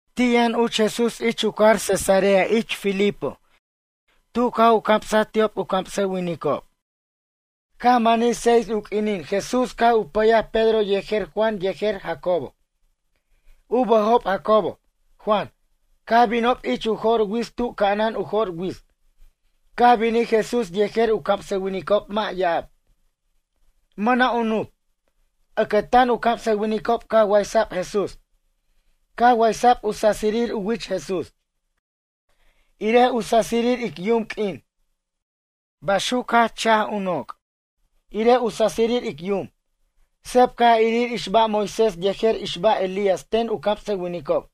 Ti' yʌn uch Jesús ich u cajar Cesarea de Filipo tu caj u camsej ti'ob u camsʌwinicob. Caj manij seis u q'uinin Jesús caj u pʌyaj Pedro yejer Juan yejer Jacobo. U bʌjob Jacobo, Juan. Caj binob ich u jo'r wits tu ca'anan u jo'r wits. Caj binij Jesús yejer u camsʌwinicob mʌ' ya'ab. Mʌna' u nup. Ʌcʌtan u camsʌwinicob caj waysa'b Jesús. Caj waysa'b u sasirir u wich Jesús, irej u sasirir ic yum q'uin. Baxuc u jach cha'aj u noc', irej u sasirir ic yum. Seb caj irir ix ba' Moisés yejer ix ba' Elías ten u camsʌwinicob.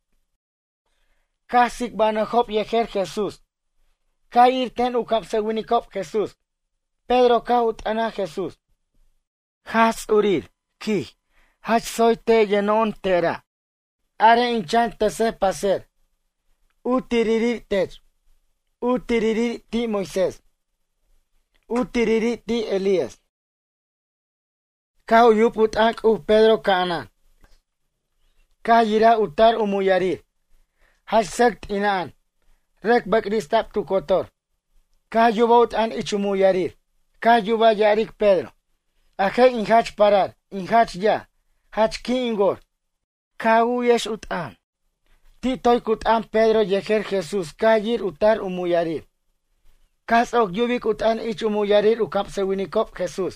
Caj tsicbanʌjob yejer Jesús, caj ir ten u camsʌwinicob Jesús. Pedro caj u t'ʌnaj Jesús: ―Jaj Ts'urir ―quij―. Jach tsoy te' yʌno'ona' tera'. Arej in chan tʌsej paser. U tiriri' tech. U tiriri' ti' Moisés. U turiri' ti' Elías. Caj u yub u t'ʌn C'uj Pedro ca'anan. Caj yiraj u tar u muyarir, jach sʌc t'ina'an, rʌc bʌcrista'b tu cotor. Caj yubaj u t'ʌn ich u muyarir. Caj yubaj ya'aric Pedro: ―A je' in jach parar, in jach yaj. Jach qui' in wor. Ca' a u'yex u t'ʌn. Ti' toy cu t'ʌn Pedro yejer Jesús caj yir u tar u muyarir. Caj ts'oc yubic u t'ʌn ich u muyarir u camsʌwinicob Jesús,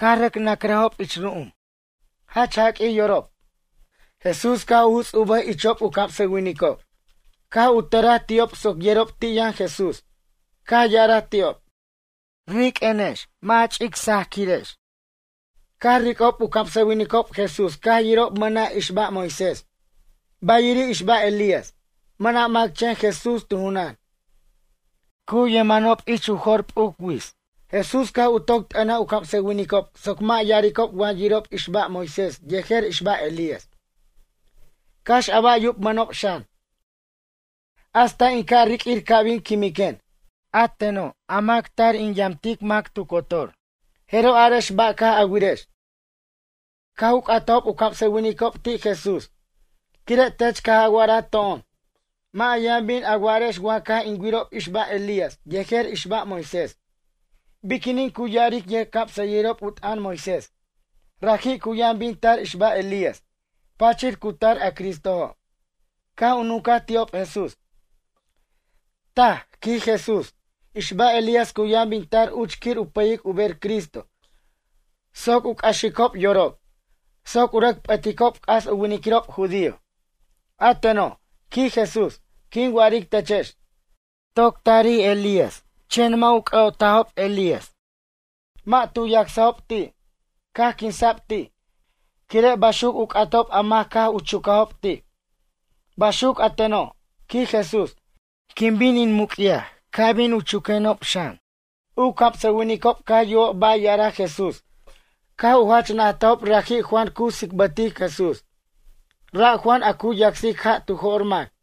caj rʌc nacrʌjob ich ru'um. Jach jaq'uij yorob. Jesús caj u juts' u bʌj ichob u camsʌwinicob. Caj u tʌraj ti'ob soc yerob ti' yʌn Jesús. Caj ya'araj ti'ob: ―Riq'uenex mʌ' a ch'ic sajaq'uirex. Caj ric'ob u camsʌwinicob Jesús caj yirob mʌna' ix ba' Moisés, bayiri' ix ba' Elías. Mʌna' mac chen Jesús tu junan. Cu yemenob ich u jo'r p'uc wits. Jesús caj u toc t'ʌnaj u camsʌwinicob soc mʌ' ya'aricob wa yirob ix ba' Moisés yejer ix ba' Elías, cax a ba' yubmʌnob xan, hasta in ca' riq'uir ca' bin quimiquen, a teno' a mac tar u yamtic mac tu cotor. Jeroj arex a ba' caj a wirex. Caj u c'atajob u camsʌwinicob ti' Jesús: ―Quire' tech caj a wa'araj to'on. Mʌ' a yʌn bin a wa'arex wa caj in wirob ix ba' Elías yejer ix ba' Moisés. Biquinin cu ya'aric yʌjcamsʌyʌjirob u t'ʌn Moisés: “Raji' cu yʌn bin tar ix ba' Elías, pachir cu tar a Cristojo”? Caj u nuncaj ti'ob Jesús: ―Taj ―quij Jesús―. Ix ba' Elías cu yʌn bin tar uch quir u pʌyic u ber Cristo soc u c'axicob yorob, soc u rʌc p'ʌticob c'as u winiquirob judío. A teno', ―quij Jesús―, quin wa'aric techex, toc tarij Elías chen mʌ' u c'ʌ'otajob Elías. Mʌ' tu yacsajob ti', caj quinsa'b ti', quire' baxuc u c'atob a mac caj u chucajob ti'. Baxuc a teno' ―quij Jesús―, quin bin in muc'yaj ca' bin u chuquenob xan. U camsʌwinicob caj yubob ba' ya'araj Jesús caj u jach najtajob raji' Juan cu tsicbʌtic Jesús. Ra' Juan a cu yacsic ja' tu jo'r mac.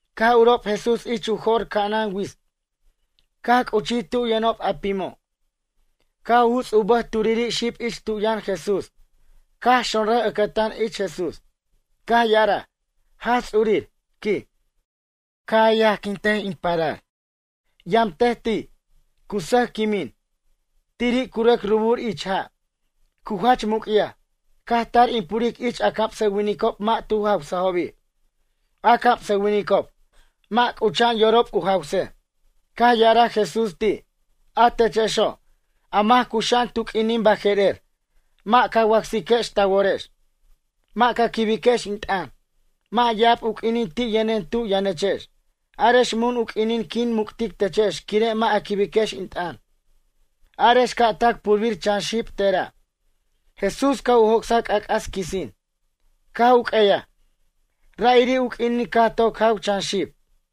Caj urob Jesús ich u jo'r ca'anan wits. Caj c'uchij tu yʌnob a pimo'. Caj u juts u bʌj turi' xib ich tu yʌn Jesús. Caj xonrʌj ʌcʌtan ich Jesús. Caj ya'araj: ―Jaj Ts'urir ―quij―. Ca' yajquintej in parar. Yamtej ti', cu sʌj quimin. Tiri' cu rʌc rubur ich ja'. Cu jach muc'yaj. Caj tar in puric ich a camsʌwinicob mʌ' tu jawsajobi'. A camsʌwinicob, mʌ' c'ucha'an yorob u jawsej. Caj ya'araj Jesús ti': ―A techexo', a mac cuxa'an tu q'uinin baje'rer, mʌ' ca wacsiquex ta worex. Mʌ' ca quibiquex in t'ʌn. Mʌ' ya'ab u q'uinin ti' yʌnen tu yʌnechex. Arex mun u q'uinin quin muc'tic techex quire' mʌ' a quibex in t'ʌn. Arex ca' tac purbir chan xib tera'. Jesús caj u joc'saj c'ac'as quisin. Caj u q'ueyaj. Ra'iri' u q'uinin caj toc jaw chan xib.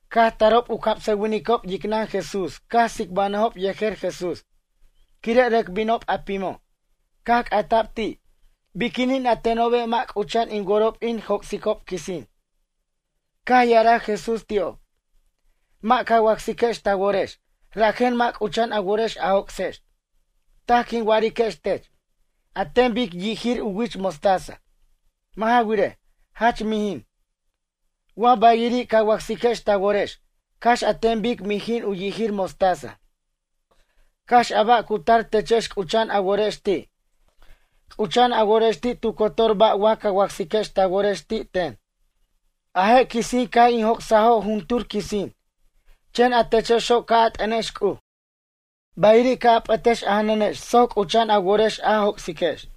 Caj tarob u camsʌwinicob yicnʌn Jesús caj tsicbanʌjob yejer Jesús, quire' rʌc binob a pimo'. Caj c'ata'bi ti': ―Biquinin a tenobe' mʌ' c'ucha'an in worob in joc'sicob quisin? Caj ya'araj Jesús ti'ob. ―Mʌ' ca wacsiquex ta worex, rajen mʌ' c'ucha'an a worex a joc'sex. Taj quin wa'ariquex tech, an ten bic yijir u wich mostaza. Mʌ' ja wirej, jach mijin. Wa bayiri' ca wacsiquex ta worex, cax an ten bic mijin u yijir mostaza, cax a ba' cu tar techex c'ucha'an a worex ti'. C'ucha'an a worex ti' tu cotor ba' wa ca wacsiquex ta worex ti' ten. A je' quisin caj in joc'sajo' juntur quisin. Chen a techexo' ca' a t'ʌnex C'uj. Bayiri' ca' a p'ʌtex a janʌnex soc c'ucha'an a worex a joc'siquex.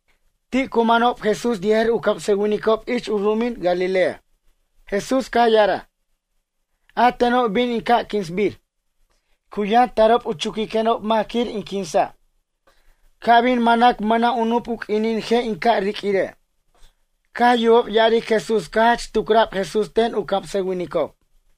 Ti' cu manob Jesús yejer u camsʌwinicob ich u ru'umin Galilea. Jesús caj ya'araj: ―A teno' bin in ca' quinsbir. Cu yʌn tarob u chuquiquenob mac quir in quinsa'. Ca' bin mʌnac mʌna' u nup u q'uinin je' in ca' riq'uire'. Caj yubob ya'aric Jesús caj jach tucra'b Jesús ten u camsʌwinicob.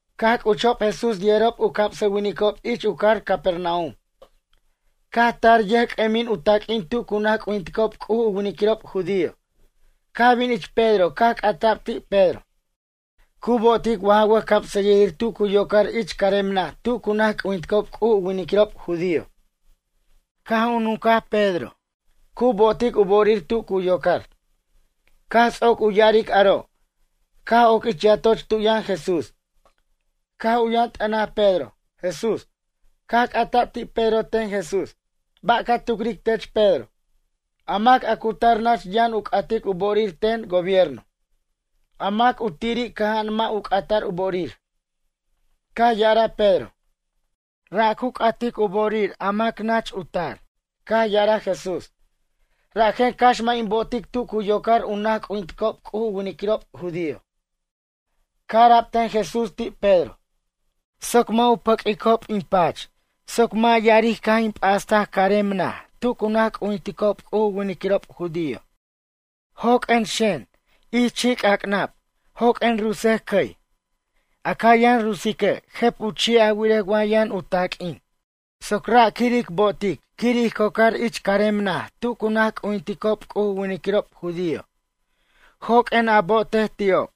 Caj c'uchob Jesús yejerob u camsʌwinicob ich u cajar Capernaum. Caj tar yʌjc'ʌmin u taq'uin tu cu naj c'ujinticob C'uj u winiquirob judío. Caj bin ich Pedro caj c'ata'b ti' Pedro: ―Cu bo'otic wa ja wʌjcamsʌyʌjir tu cu yocar ich carem naj tu cu naj c'ujinticob C'uj u winiquirob judío? Caj nuncaj Pedro: ―Cu bo'otic u bo'orir tu cu yocar. Caj ts'oc u ya'aric aro', caj oc ich yatoch tu yʌn Jesús. Caj u yʌn t'ʌnaj Pedro, Jesús. Caj c'ata'b ti' Pedro ten Jesús: ―Ba' ca tucric tech Pedro. A mac a cu tar nach yʌn u c'atic u bo'orir ten gobierno. A mac a tiri' cʌja'an mʌ' u c'ata'r u bo'orir? Caj ya'araj Pedro: ―Ra' cu c'atic u bo'orir a mac nach u tar. Caj ya'araj Jesús: ―Rajen cax mʌ' in bo'otic tu cu yocar u naj c'ujinticob C'uj u winiquirob judío. Caj ara'b ten Jesús ti' Pedro: ―Soc mʌ' u pʌq'uicob in pach soc mʌ' ya'aric caj in p'astaj carem naj tu cu naj c'ujinticob C'uj u winiquirob judío. Joq'uen xen ich chi'c'ac'nab joq'uen rutsej cʌy. A ca yʌn rutsique' jʌp u chi' a wirej wa yʌn u taq'uin. Ra' soc quir a bo'otic quir ij cocar carem naj tu cu naj c'ujinticob C'uj u winiquirob judío. Joq'uen a bo'otej ti'ob.